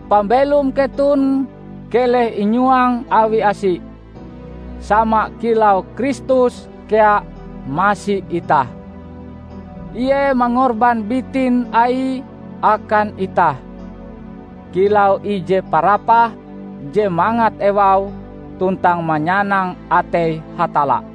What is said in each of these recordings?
Pambelom keton keleh inyuang awi asi, sama kilau Kristus kea masi itah. Ie mangorban bitin Aie akan itah, kilau ije parapah je mangat ewaue tuntang manyanang atei Hatalla.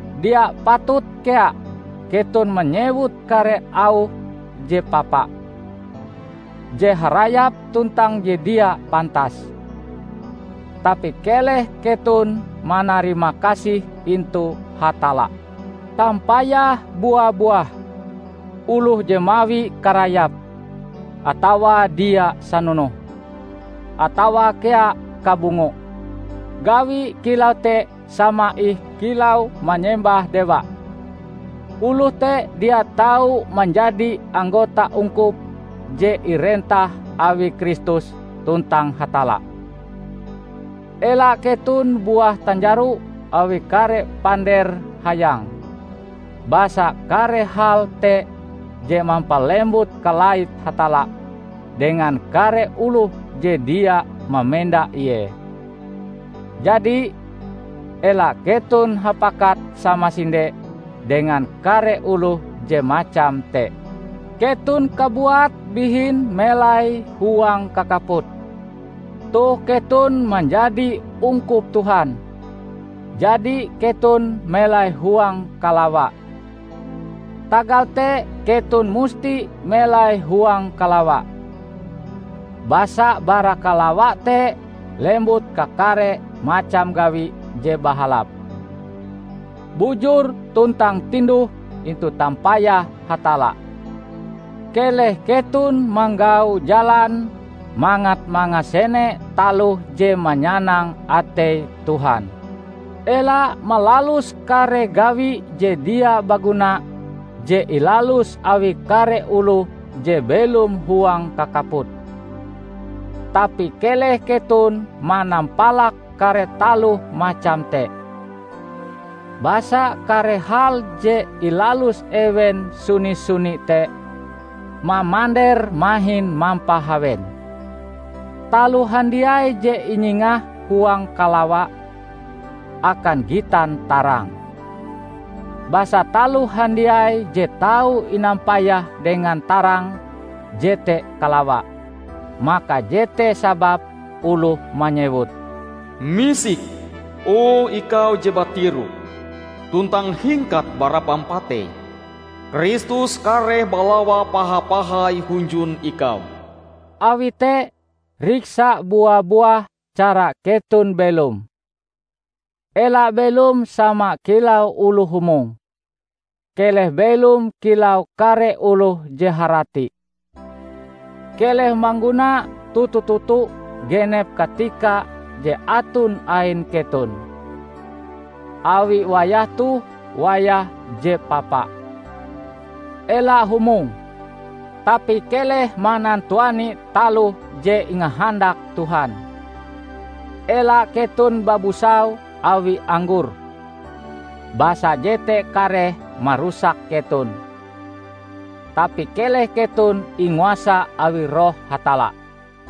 Dia patut kea keton manyewut kare auh je papa, je harayap tuntang je dia pantas. Tapi keleh keton manarimakasih intu Hatalla. Tampayah bua-buah: oloh je mawi karayap, atawa dia sanonoh, atawa kea kabungo (gawi kilau te sama ih kilau manyembah dewa), oloh te dia tau manjadi anggota ungkup je irentah awi Kristus tuntang Hatalla. Ela keton buah tanjaro awi kare pander hayang. Basa kare hal te je mampalembut kalait Hatalla dengan kare oloh je dia mamenda Ie. Jadi, ela keton hapakat samasinde dengan kare oloh je macam te. Keton kabuat bihin melai huang kakaput. Toh keton manjadi ungkup Tuhan, jadi keton melai huang kalawa. Tagal te keton musti melai huang kalawa. Basa bara kalawa te lembut kakare macam gawi je bahalap, bujur tuntang tinduh intu tampayah Hatalla. Keleh keton manggau jalan mangat mangasene taloh je manyanang atei Tuhan. Ela malalus kare gawi je dia baguna je ilalus awi kare oloh je belom huang kakaput. Tapi keleh keton manampalak kare taloh macam te. ( Basa kare hal je ilalus ewen suni-suni te, mamandere mahin mampahawen.) Taloh handiai je inyingah huang kalawa, akan gitan tarang. Basa taloh handiai je tau inampayah dengan tarang, jete kalawa. Maka jete sababe oloh manyewut, "Misik, o ikau je batiroh, tuntang hingkat bara pampatei! Kristus kareh balawa paha-pahai hunjun ikau." Awi te, riksa bua-buah cara keton belom. Ela belom sama kilau oloh humong; keleh belom kilau kare oloh je harati. Keleh mangguna toto-toto genep katika je aton ain keton, awi wayah toh wayah je papa. Ela humong, tapi keleh manantuani taloh je ingahandak Tuhan. Ela keton babusau awi anggor, basa jete kareh marusak keton. Tapi keleh keton inguasa awi Roh Hatalla.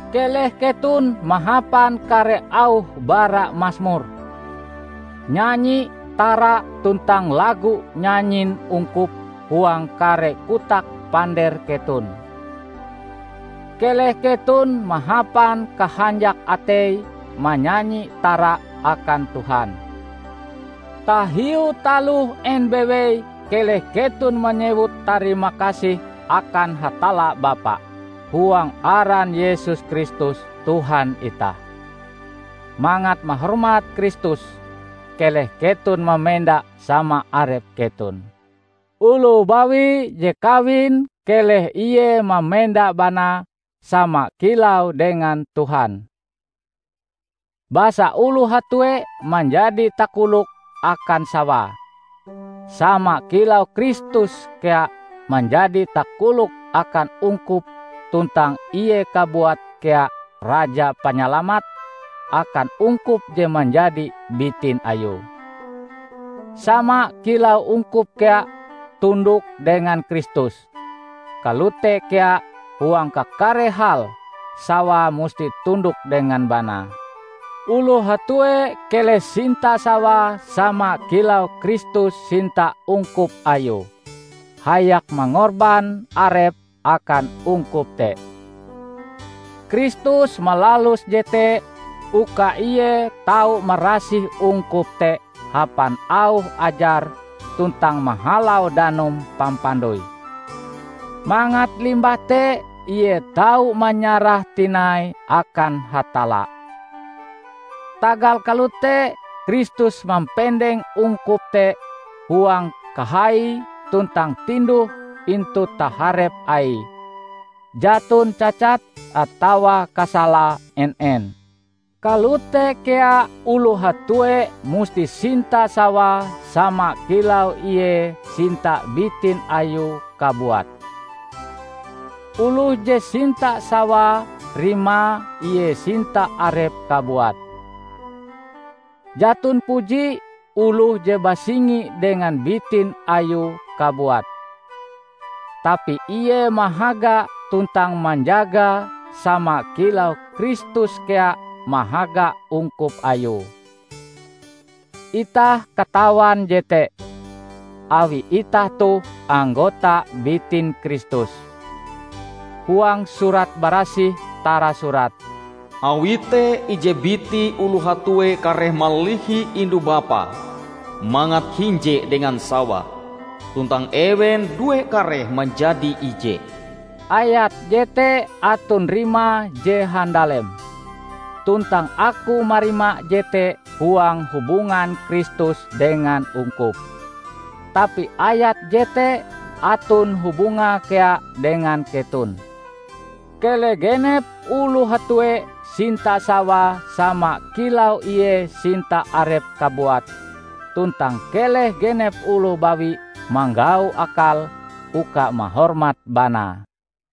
Keleh keton mahapan kare auh bara Masmur, nyanyi tara tuntang lago nyanyin ungkup huang kare kotak pander keton. Keleh keton mahapan kahanjak atei manyanyi tara akan Tuhan. Tahiu taloh en bewei keleh keton manyewut tarimakasih akan Hatalla Bapa, huang aran Yesus Kristus Tuhan itah. Mangat mahormat Kristus, keleh keton mamenda sama arep keton. Oloh bawi je kawin keleh ie mamenda banae, sama kilau dengan Tuhan. Basa oloh hatue manjadi takolok akan sawae, sama kilau Kristus kea manjadi takolok akan ungkup tuntang Ie kabuat kea Raja Panyalamat akan ungkup je manjadi bitin Ayue. Sama kilau ungkup kea tundok dengan Kristus, kalote kea huang kakare hal sawae musti tundok dengan banae. Oloh hatue keleh sinta sawae sama kilau Kristus sinta ungkup Ayue hayak mangorban Arepe akan ungkup te. Kristus malalus jete uka Ie tau marasih ungkup te hapan auh Ajare tuntang mahalau danum pampandoi, mangat limbah te Ie tau manyarahe tinai akan Hatalla. Tagal kalote Kristus mampendeng ungkup te huang kahai tuntang tinduh intu taharep Aie, jaton cacat atawa kasalae en-en. Kalote kea oloh hatue musti sinta sawae sama kilau ie sinta bitin Ayue kabuat. Oloh je sinta sawae rimae ie sinta arepe kabuat. ( Jaton puji oloh je basingi dengan bitin Ayue kabuat. Tapi ie mahaga tuntang manjagae sama kilau Kristus kea mahaga ungkup Ayue. Itah katawan jete, awi itah toh anggota bitin Kristus.) Huang Surat Barasih tarasurat, "Awi te ije biti oloh hatue kareh malihi indu-bapae mangat hinje dengan sawae, tuntang ewen due kareh manjadi ije." Ayat jete aton rimae je handalem. Tuntang aku marima jete huang hubungan Kristus dengan ungkup. Tapi ayat jete aton hubungae kea dengan keton: Keleh genep oloh hatue sinta sawae sama kilau ie sinta arepe kabuat tuntang keleh genep oloh bawi manggau akal uka mahormat banae.